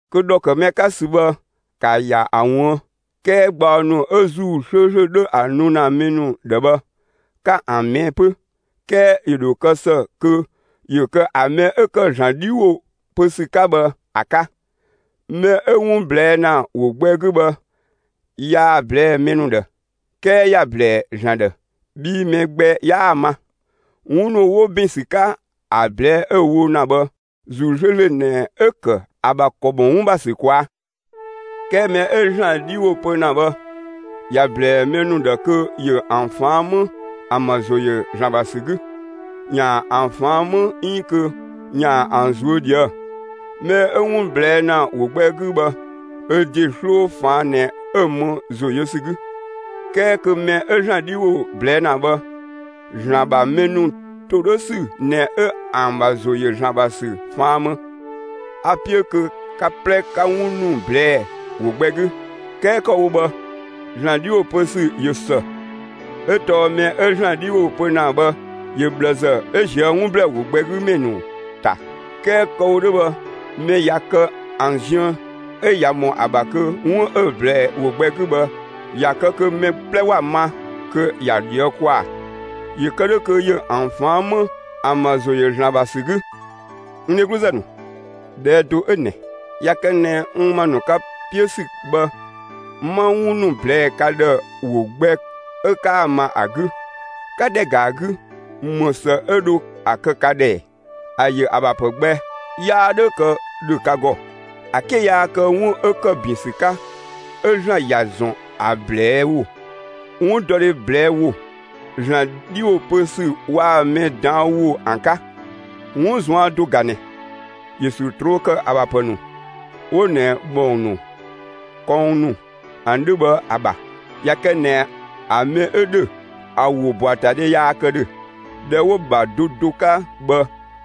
Kö ‑dhɔ ‑kë mɛ 'ka ‑sü bhë, ‑ka ‑ya ‑a ꞊wuën'! 'Kɛɛ gbaɔ ‑nu 'ö ‑Zuu 'slööslö 'dhö ‑a nu ‑na mɛ ‑nu ‑dhë bhë, ‑ka ‑an ꞊mɛɛ' 'pö; 'kɛɛ ‑yö ‑dho kë ‑së kö ‑yö kë ‑a mɛ 'ö ‑kë ‑Zlan 'dhi ‑wo pö ‑sü 'ka bhë ‑a 'ka. Mɛ 'ö 'wun ꞊blɛɛ' ‑na ‑wo gbɛ 'gü bhë, yaa‑ ꞊blɛɛ'‑ mɛ ‑nu ‑dhë, 'kɛɛ ‑ya ‑blɛɛ ‑Zlan ‑dhë, bhii mɛ gbɛ 'yaa‑ ma. 'Wun ‑nu 'wo ‑bin ‑sü 'ka ‑a ꞊blɛɛ' 'ö‑ wo ‑na bhë, ‑Zuu 'slööslö ꞊nɛ 'ö ‑kë ‑a ‑bha ‑kɔ ‑mɔ 'wun ‑bha ‑sü ꞊kwaa'. 'Kɛɛ mɛ 'ö ‑Zlan 'dhi ‑wo pö ‑na bhë, ‑ya ꞊blɛɛ mɛ ‑nu ‑dhë kö ‑yö ‑an ꞊faan' 'më ‑an ‑bha ‑zo ‑yö ‑Zlan ‑bha ‑sü 'gü, ‑yaan ‑an ꞊faan' 'më 'iin kö ‑yaan ‑an ꞊zuö' ꞊dhuë'‑. Mɛ 'ö 'wun ꞊blɛɛ' ‑na ‑wo gbɛ 'gü bhë, ö ‑de 'sloo ꞊faan' ꞊nɛ 'ö‑ më ‑zo yö ‑sü 'gü, 'kɛɛ kö mɛ 'ö ‑Zlan 'dhi ‑wo ꞊blɛɛ' ‑na bhë, ‑Zlan ‑bha mɛ ‑nu ‑todhösü ꞊nɛ 'ö ‑an ‑bha ‑zo ‑yö ‑Zlan ‑bha ‑sü ꞊faan' më. A‑ 'piö kö ka 'plɛ 'ka 'wun ‑nu ꞊blɛɛ'‑ ‑wo gbɛ 'gü; 'kɛɛ kë‑ wo bhë, ‑Zlan 'dhi ‑wo pö ‑sü ꞊yö ‑së, 'ö tɔɔ mɛ 'ö ‑Zlan 'dhi ‑wo pö ‑na bhë, ‑yö ꞊bhlëzë 'ö ꞊zië' 'wun ‑blɛɛ ‑wo gbɛ 'gü ‑mɛ ‑nu ‑ta. 'Kɛɛ kë‑ wo 'dhö bhë, mɛ ꞊ya kë ‑an ziën 'ö ꞊ya ‑mɔ ‑a ‑bha kö 'wun 'ö ꞊blɛɛ ‑wo gbɛ 'gü bhë, ‑ya kë kö mɛ 'plɛ ‑wa ma, kö ‑ya ꞊dhië' ‑kwaa ‑yö kë 'dhö kö ‑yö ‑an ꞊faan' 'më ‑an ‑bha ‑zo ‑yö ‑Zlan ‑bha ‑sü 'gü. N dhegluzë ‑nu, ꞊dhɛɛ' do 'ö ꞊nɛ: ꞊Ya kë ꞊nɛ n ‑ma ‑nu ka 'piö ‑sü bhë, 'ma 'wun ‑nu ꞊blɛɛ'‑ ka ‑dhë ‑wo gbɛ 'ö 'kaa‑ ma ‑a 'gü, 'ka ‑dhɛ ‑ga 'gü, ‑më ‑së 'ö dho ‑a kë ka ‑dhë ‑ɛɛ? ‑A ‑yö ‑a ‑bha ‑pë gbɛ yaa 'dhö kë ‑dhö ka ‑gɔ, ‑a 'ke yaa kë 'wun 'ö ‑kë ‑bin ‑sü 'ka 'ö ‑Zlan ‑ya ‑zɔn ‑a ꞊blɛɛ' ‑wo, 'wundɔdhe ꞊blɛɛ' ‑wo, ‑Zlan 'dhi ‑wo pö ‑sü waa‑ mɛ ꞊daan' ‑wo ‑an 'ka. 'Wun ꞊zuan' do ꞊ga ꞊nɛ; ‑yö ‑sü ꞊troo' ‑kë ‑a ‑bha ‑pë ‑nu, 'wo ꞊nɛ ‑bhɔng ‑nu, kɔng ‑nu ‑an 'dhö bhë ‑a ‑bha. ꞊Ya kë ꞊nɛ ‑a mɛ 'ö ‑dhö ‑a ‑wobɔatadhe yaa kë ‑dhö, ‑dhɛ 'wo‑ ‑bha do do 'ka bhë,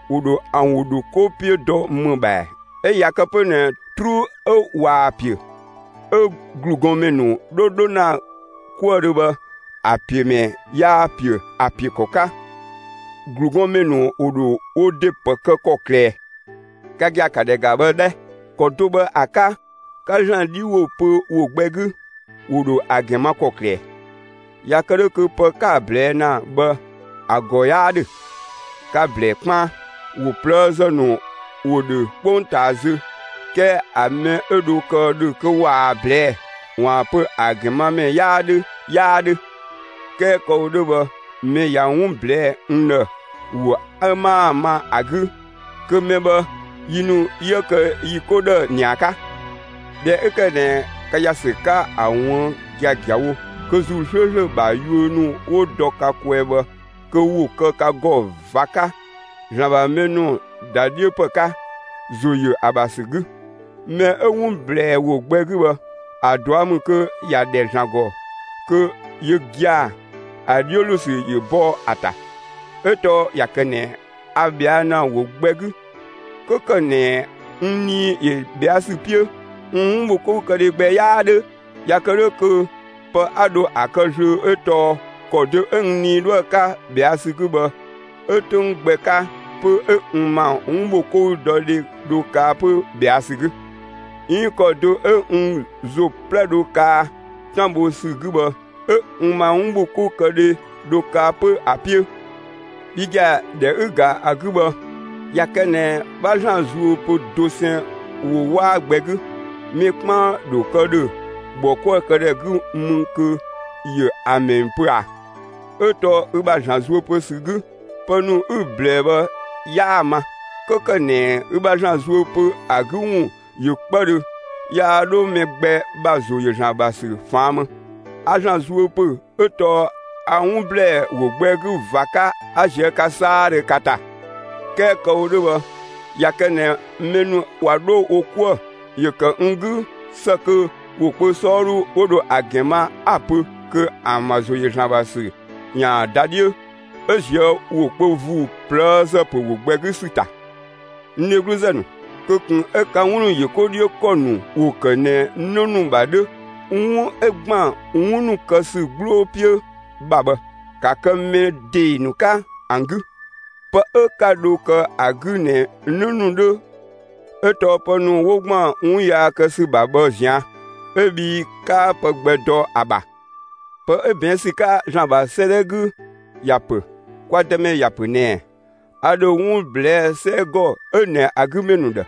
‑wo ‑dho ‑an ‑wo ‑dho 'ko 'piö dɔ ‑më ‑bha ‑ɛɛ? 'Ö ꞊ya kë 'pö ꞊nɛ 'truu 'ö ꞊waa‑ ‑piö, 'ö ‑glugɔnmɛ ‑nu 'dho ‑na 'kuëdhö bhë, ‑a ‑piö mɛ 'yaa‑ ‑piö ‑a ‑piö ‑kɔ 'ka, ‑glugɔnmɛ ‑nu ‑wo dho wo ‑de ‑pë kë ‑kɔklë ꞊ɛɛ? Ka gia‑, ‑ka ‑dhɛ ‑ga bhë 'dhɛ! ‑Kɔ do bhë ‑a 'ka, 'ka ‑Zlan 'dhi ‑wo pö ‑wo gbɛ 'gü, ‑wo ‑dho ‑a ‑gɛn ma ‑kɔklë ꞊ɛɛ? ꞊Ya kë 'dhö kö pë 'ka‑ ꞊blɛɛ' ‑na bhë ‑a ‑gɔ 'yaa ‑dhö, ka‑ ‑blɛɛ 'kpaan. ‑Wo ꞊plëëzë ‑nu ‑wo ‑dhö 'kpongtaa zö, 'kɛɛ ‑a mɛ 'ö dho kë ‑dhö kö ꞊waa‑ ꞊blɛɛ' ‑waan pö ‑a ‑gɛn ma ‑mɛ 'yaa 'dhö, 'yaa ‑dhö. 'Kɛɛ kë‑ wo 'dhö bhë, mɛ ꞊ya 'wun ꞊blɛɛ'‑ n ‑dhë ‑wo 'ö 'maa‑ ma ‑a 'gü, kö mɛ bhë, yi ‑nu 'yië kë yi 'ko ‑dhë ‑nia 'ka. ꞊Dhɛ 'ö ‑kë ꞊nɛ ka ‑ya ‑sü 'ka ‑a ꞊wuën' giagiawo kö ‑Zuu 'slööslö ‑bha yuö ‑nu ‑wo dɔ ka kwɛɛ bhë, kö ‑wo kë ka ‑gɔ ꞊va 'ka ‑Zlan ‑bha mɛ ‑nu ‑da 'dhiö ‑pë 'ka, ‑zo ‑yö ‑a ‑bha ‑sü 'gü. Mɛ 'ö 'wun ꞊blɛɛ ‑wo gbɛ 'gü bhë, ‑a ꞊dua' ‑mü kö ‑ya ‑dhɛ ‑Zlan ‑gɔ kö (yö gia‑) ‑a 'dhiö ‑lo ‑sü ‑yö bɔ ‑a ‑ta. 'Ö tɔɔ ꞊ya kë ꞊nɛ a ꞊bhɛa' ‑na ‑wo gbɛ 'gü, 'kö ‑kë ꞊nɛ n 'nii‑ ‑yö ꞊bhɛa' ‑sü 'piö, n 'wunbhokoukëdhe gbɛ 'yaa 'dhö. ꞊Ya kë 'dhö kö pë 'a dho ‑a kë zlöö 'ö tɔɔ ‑kɔ do 'ö n nii 'dhoë‑ 'ka ꞊bhɛa' ‑sü 'gü bhë, 'ö 'töng gbɛ 'ka 'pö 'ö n ‑ma 'wunbhokoukëdhe dho kaa 'pö ꞊bhɛa' ‑sü 'gü; 'iin ‑kɔ do 'ö n ‑zo 'plɛ dho kaa 'tan bho ‑sü 'gü bhë 'ö n ‑ma 'wunbhokoukëdhe dhö kaa 'pö ‑a 'piö. Bhi gia‑, ꞊dhɛ 'ü‑ ‑ga ‑a 'gü bhë, ꞊ya kë ꞊nɛ 'bha ‑Zlan zuö pö dosɛn ‑wo 'waa gbɛ 'gü, mɛ 'kpaan ‑dho kë ‑dhö ‑bhɔkuëkëdhɛ 'gü mü kö ‑yö amɛn pö ꞊a? 'Ö tɔɔ ü ‑bha ‑Zlan zuö pö ‑sü 'gü, pë ‑nu 'ü‑ ꞊blɛɛ' bhë 'yaa‑ ma. 'Kö ‑kë ꞊nɛ ü ‑bha ‑Zlan zuö ‑pö ‑a 'gü ‑wun ꞊yö 'kpëdhö, yaa 'dho mɛ gbɛ ‑bha ‑zo ‑yö ‑Zlan ‑bha ‑sü ꞊faan' më. A ‑Zlan zuö ‑pö 'ö tɔɔ a 'wun ‑blɛɛ ‑wo gbɛ 'gü ꞊va 'ka 'a ꞊zië' ka 'saadhö ka ‑ta. 'Kɛɛ kë‑ wo 'dhö bhë, ꞊ya kë ꞊nɛ mɛ ‑nu ꞊wa 'dho wo 'kuë‑, ‑yö ‑kë n 'gü ‑së kö ‑wo kpö 'sɔɔdhu 'wo dho ‑a ‑gɛn ma, 'a‑ pö kö ‑an ‑bha ‑zo ‑yö ‑Zlan ‑bha ‑sü ‑yaan ‑da 'dhiö 'ö ꞊zië' ‑wo kpö ‑vuu ꞊plëëzë ‑pö ‑wo gbɛ 'gü ‑sü ‑ta. N dhegluzë ‑nu, kö ꞊kun 'ö ka 'wun ‑nu ‑yö 'ko 'dhiö ‑kɔ ‑nu ‑wo ‑kë ꞊nɛ 'në ‑nu ‑bha 'dhö; 'wun 'ö ‑gban 'wun ‑nu kë ‑sü 'gbloo 'piö ‑bha bhë, ‑ka kë mɛ ‑dee ‑nu 'ka ‑an 'gü! Pë 'ö 'ka dho kë ‑a 'gü ꞊nɛ 'në ‑nu 'dhö 'ö tɔɔ pë ‑nu 'wo ‑gban 'wun yaa kë ‑sü ‑bha bhë ꞊zian' 'ö bhii 'kaa pë gbɛ dɔ ‑a ‑bha. Pë 'ö ꞊bɛɛn' ‑sü 'ka ‑Zlan ‑bha 'sëëdhɛ 'gü ‑ya ‑pö: Kwa Dëmɛ ‑ya ‑pö ꞊nɛɛ: A ‑dho 'wun ꞊blɛɛ'‑ 'sɛgɔ 'ö ꞊nɛ ‑a 'gü ‑mɛ ‑nu ‑dhë;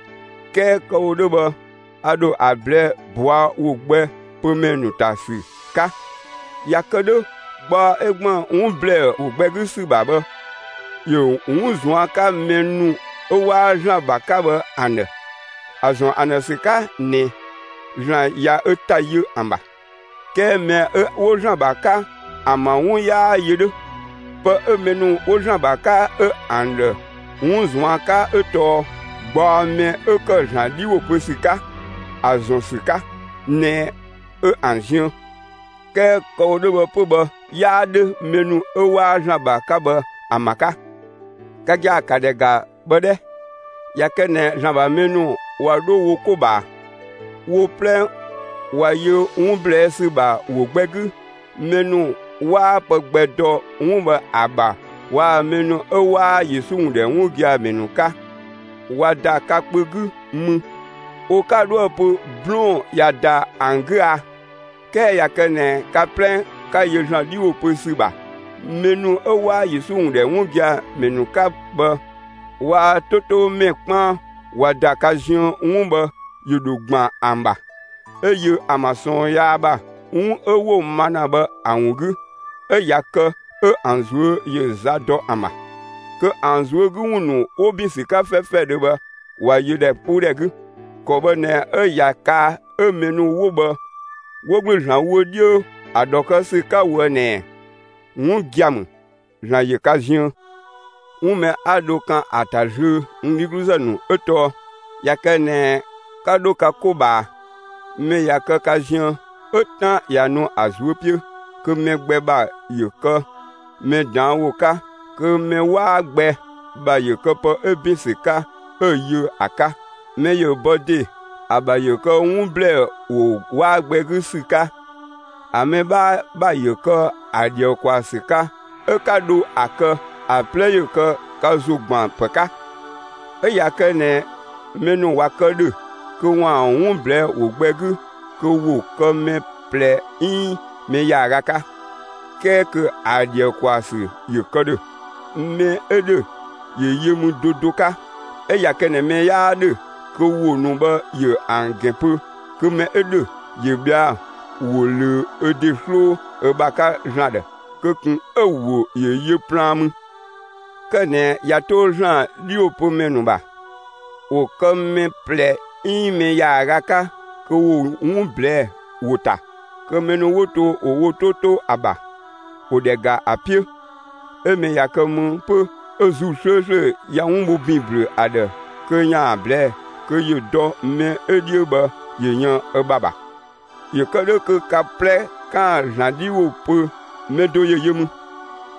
'kɛɛ kë‑ wo 'dhö bhë a ‑dho ‑a ꞊blɛɛ'‑ ꞊bɔa' ‑wo gbɛ pö ‑mɛ ‑nu ‑ta ‑sü 'ka. ꞊Ya kë 'dhö, gbaɔ 'ö ‑gban 'wun ‑blɛɛ ‑wo gbɛ 'gü ‑sü ‑bha bhë, ‑yö 'wun ꞊zuan' 'ka mɛ ‑nu 'ö 'waa ‑Zlan ‑bha 'ka bhë ‑an ‑dhë (‑a ‑zɔn ‑an ‑dhë ‑sü 'ka ꞊nɛ ‑Zlan ꞊ya ö ‑ta yö ‑an ‑bha); 'kɛɛ mɛ 'ö 'wo ‑Zlan ‑bha 'ka ‑an ‑bha 'wun 'yaa yö 'dhö; pë 'ö mɛ ‑nu 'wo ‑Zlan ‑bha 'ka 'ö ‑an ‑dhë 'wun ꞊zuan' 'ka 'ö tɔɔ gbaɔ mɛ 'ö ‑kë ‑Zlan 'dhi ‑wo pö ‑sü 'ka (‑a ‑zɔn ‑sü 'ka ꞊nɛ 'ö ‑an ziën). 'Kɛɛ kë‑ wo 'dhö 'pö bhë 'yaa 'dhö mɛ ‑nu 'ö 'waa ‑Zlan ‑bha 'ka bhë ‑an ‑bha 'ka. Ka gia‑, ‑ka ‑dhɛ ‑ga bhë 'dhɛ! ꞊Ya kë ꞊nɛ ‑Zlan ‑bha mɛ ‑nu ꞊wa 'dho wo 'ko ꞊bhaa, wo 'plɛ ꞊wa yö 'wun ꞊blɛɛ' ‑sü ‑bha ‑wo gbɛ 'gü, mɛ ‑nu 'waa pë gbɛ dɔ 'wun bhë ‑a ‑bha waa‑ mɛ ‑nu 'ö 'waa Yesu ‑wun ‑dhɛ 'wun gia‑ ‑mɛ ‑nu 'ka, ꞊wa ‑da ka kpö 'gü mü, wo 'ka 'dhoë‑ pö 'blɔɔn‑ ꞊ya ‑da ‑an 'gü a? 'Kɛɛ ꞊ya kë ꞊nɛ ka 'plɛ 'ka yö ‑Zlan 'dhi ‑wo pö ‑sü ‑bha, mɛ ‑nu 'ö 'waa Yesu ‑wun ‑dhɛ 'wun gia‑ ‑mɛ ‑nu 'ka bhë waa‑ 'to 'to ‑mɛ 'kpaan ꞊wa ‑da ka ziën, 'wun bhë ‑yö ‑dho ‑gban ‑an ‑bha, 'ö yö ‑an ‑bha ꞊sɔɔn yaa ‑bha, 'wun 'ö 'wo‑ ma ‑na bhë ‑a ‑wun 'gü; 'ö ꞊ya kë 'ö ‑an ꞊zuö' ‑yö za dɔ ‑an ‑bha, kö ‑an ꞊zuö' 'gü ‑wun ‑nu 'wo ‑bin ‑sü 'ka 'fɛfɛdhö bhë ꞊wa yö ‑dhɛpuudhɛ 'gü. ‑Kɔ bhë ꞊nɛ 'ö ꞊ya kaa 'ö mɛ ‑nu 'wo bhë 'wo ‑gblü ‑Zlan ‑wo 'dhiö ‑a ‑dhɔ kë ‑sü 'ka ꞊woë' ꞊nɛɛ: «'Wun gia‑ ‑mü. ‑Zlan ‑yö ka ziën.» 'Wun mɛ 'a dho kan ‑a ‑ta zlöö, n dhegluzë ‑nu, ö tɔɔ: ꞊Ya kë ꞊nɛ 'ka 'dho ka 'ko ꞊bhaa, mɛ ꞊ya kë ka ziën 'ö 'tan ꞊ya nu ‑a ꞊zuö' 'piö, kö mɛ gbɛ ‑bha ‑yö kë mɛ ꞊daan' ‑wo 'ka, kö mɛ 'waa gbɛ ‑bha ‑yö kë pë 'ö 'bin ‑sü 'ka 'ö‑ yö ‑a 'ka, mɛ ‑yö bɔ ‑de ‑a ‑bha ‑yö kë 'wun ‑blɛɛ ‑wo 'waa gbɛ 'gü ‑sü 'ka, ‑a mɛ 'bhaa ‑bha ‑yö kë ‑a ‑dhië ‑kwaa ‑sü 'ka 'ö 'ka dho ‑a kë, ‑a 'plɛ ‑yö kë ka ‑zo ‑gban ‑pë 'ka. 'Ö ꞊ya kë ꞊nɛ mɛ ‑nu ꞊wa kë ‑dhö kö ‑waan 'wun ꞊blɛɛ'‑ ‑wo gbɛ 'gü, kö ‑wo kë mɛ ꞊plɛ 'iin mɛ ‑yaaga 'ka, 'kɛɛ kö ‑a ‑dhië ‑kwaa ‑sü ‑yö kë ‑dhö; mɛ 'ö ‑dhö, ‑yö yö mü do do 'ka. 'Ö ꞊ya kë ꞊nɛ mɛ 'yaa ‑dhö kö ‑wo ‑nu bhë ‑yö ‑an ‑gɛn pö, kö mɛ 'ö ‑dhö ‑yö ꞊bhɛa'‑ ‑wo ꞊löö ö ‑de 'sloo ö ‑bha 'ka ‑Zlan ‑dhë; kö ꞊kun 'ö‑ ‑wo ‑yö yö plaan mü. Kë ꞊nɛ ꞊ya 'to ‑Zlan 'dhiwopömɛ ‑nu ‑bha, ‑wo kë mɛ ꞊plɛ 'iin mɛ ‑yaaga 'ka kö ‑wo 'wun ꞊blɛɛ'‑ ‑wo ‑ta; kö mɛ ‑nu 'wo to, ‑wo wo 'to 'to ‑a ‑bha ‑wo ‑dhɛ ‑ga ‑a 'piö. 'Ö mɛ ꞊ya kë mü 'pö 'ö ‑Zuu 'slööslö ꞊ya 'wun bho ‑bin ‑blü ‑a ‑dhë kö ‑yaan ‑a ꞊blɛɛ'‑, kö ‑yö dɔ mɛ 'ö 'dhiö bhë ‑yö yën ö ‑bha ‑bha. ‑Yö kë 'dhö kö ka 'plɛ 'kaan‑ ‑Zlan 'dhi ‑wo pö, mɛ do ‑yö yö mü;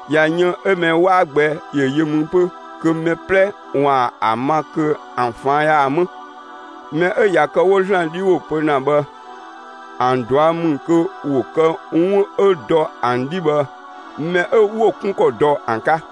꞊ya yën 'ö mɛ 'waa gbɛ ‑yö yö mü 'pö kö mɛ 'plɛ ‑waan ‑a ma kö ‑an ꞊faan' ‑yaan 'më. Mɛ 'ö ꞊ya kë 'wo ‑Zlan 'dhi ‑wo pö ‑na bhë, ‑an ꞊dua' ‑mü kö ‑wo kë 'wun 'ö dɔ ‑an 'dhi bhë mɛ 'ö 'wo‑ 'kun ‑kɔ dɔ ‑an 'ka;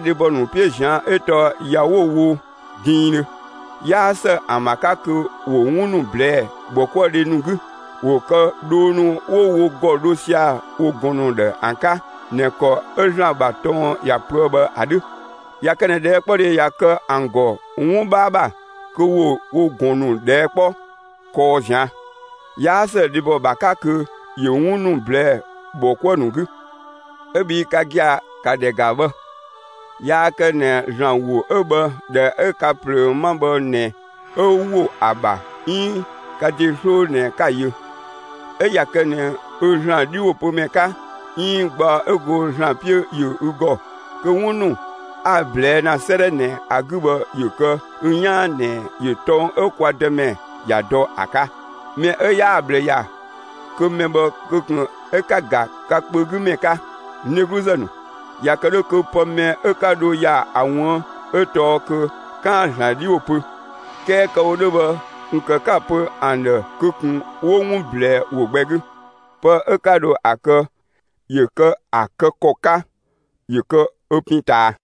dhebɔ ‑nu 'piö ꞊zian' 'ö tɔɔ ‑ya 'wo‑ wo diindhö. 'Yaa ‑së ‑an ‑bha 'ka kö ‑wo 'wun ‑nu ꞊blɛɛ'‑ ‑bhɔkuëdhe ‑nu 'gü; ‑wo kë dhoo ‑nu 'wo wo ‑gɔ dho sia‑ wo ꞊gɔn ‑nu ‑dhë ‑an 'ka ꞊nɛ ‑kɔ 'ö ‑Zlan ‑bha tɔng ‑ya pöë bhë ‑a 'dhö. ꞊Ya kë ꞊nɛ ꞊dhɛɛkpɔdhe ‑ya kë ‑an ‑gɔ 'wun 'bhaa ‑bha, kö ‑wo wo ꞊gɔn ‑nu ꞊dhɛɛ' 'kpɔ kɔɔ ꞊zian'. 'Yaa ‑së dhebɔ ‑bha 'ka kö ‑yö 'wun ‑nu ꞊blɛɛ'‑ ‑bhɔ 'kuë‑ ‑nu 'gü. 'Ö bhii ka gia‑, ‑ka ‑dhɛ ‑ga bhë! Yaa kë ꞊nɛ ‑Zlan ‑wo 'ö bhë ‑dhɛ 'ö ka ꞊plöö 'ma bhë ꞊nɛ 'ö ‑wo ‑a ‑bha 'iin ka ‑de 'sloo ꞊nɛ 'ka‑ yö. 'Ö ꞊ya kë ꞊nɛ ü ‑Zlan 'dhiwopömɛ 'ka 'iin gbaɔ 'ö go ‑Zlan 'piö ‑yö ü ‑gɔ kö 'wun ‑nu 'a‑ ꞊blɛɛ' ‑na 'sëëdhɛ ꞊nɛ ‑a 'gü bhë ‑yö kë ü 'yaan ꞊nɛ, ‑yö tɔng 'ö kwa Dëmɛ ‑ya dɔ ‑a 'ka. Mɛ 'ö 'yaa‑ ꞊bhlë ‑ya, kö mɛ bhë kö ꞊kun 'ö 'ka‑ ‑ga ka kpö 'gü ‑mɛ 'ka. N dhegluzë ‑nu, ꞊ya kë 'dhö kö pë mɛ 'ö 'ka dho ‑ya ‑a ꞊wuën' 'ö tɔɔ kö 'kaan‑ ‑Zlan 'dhi ‑wo pö. 'Kɛɛ kë‑ wo 'dhö bhë, ꞊kun ‑kë 'ka‑ pö ‑an ‑dhë kö ꞊kun 'wo 'wun ꞊blɛɛ' ‑wo gbɛ 'gü. Pë 'ö 'ka dho ‑a kë, ‑yö kë ‑a kë ‑kɔ 'ka, ‑yö kë ö pin ꞊taa.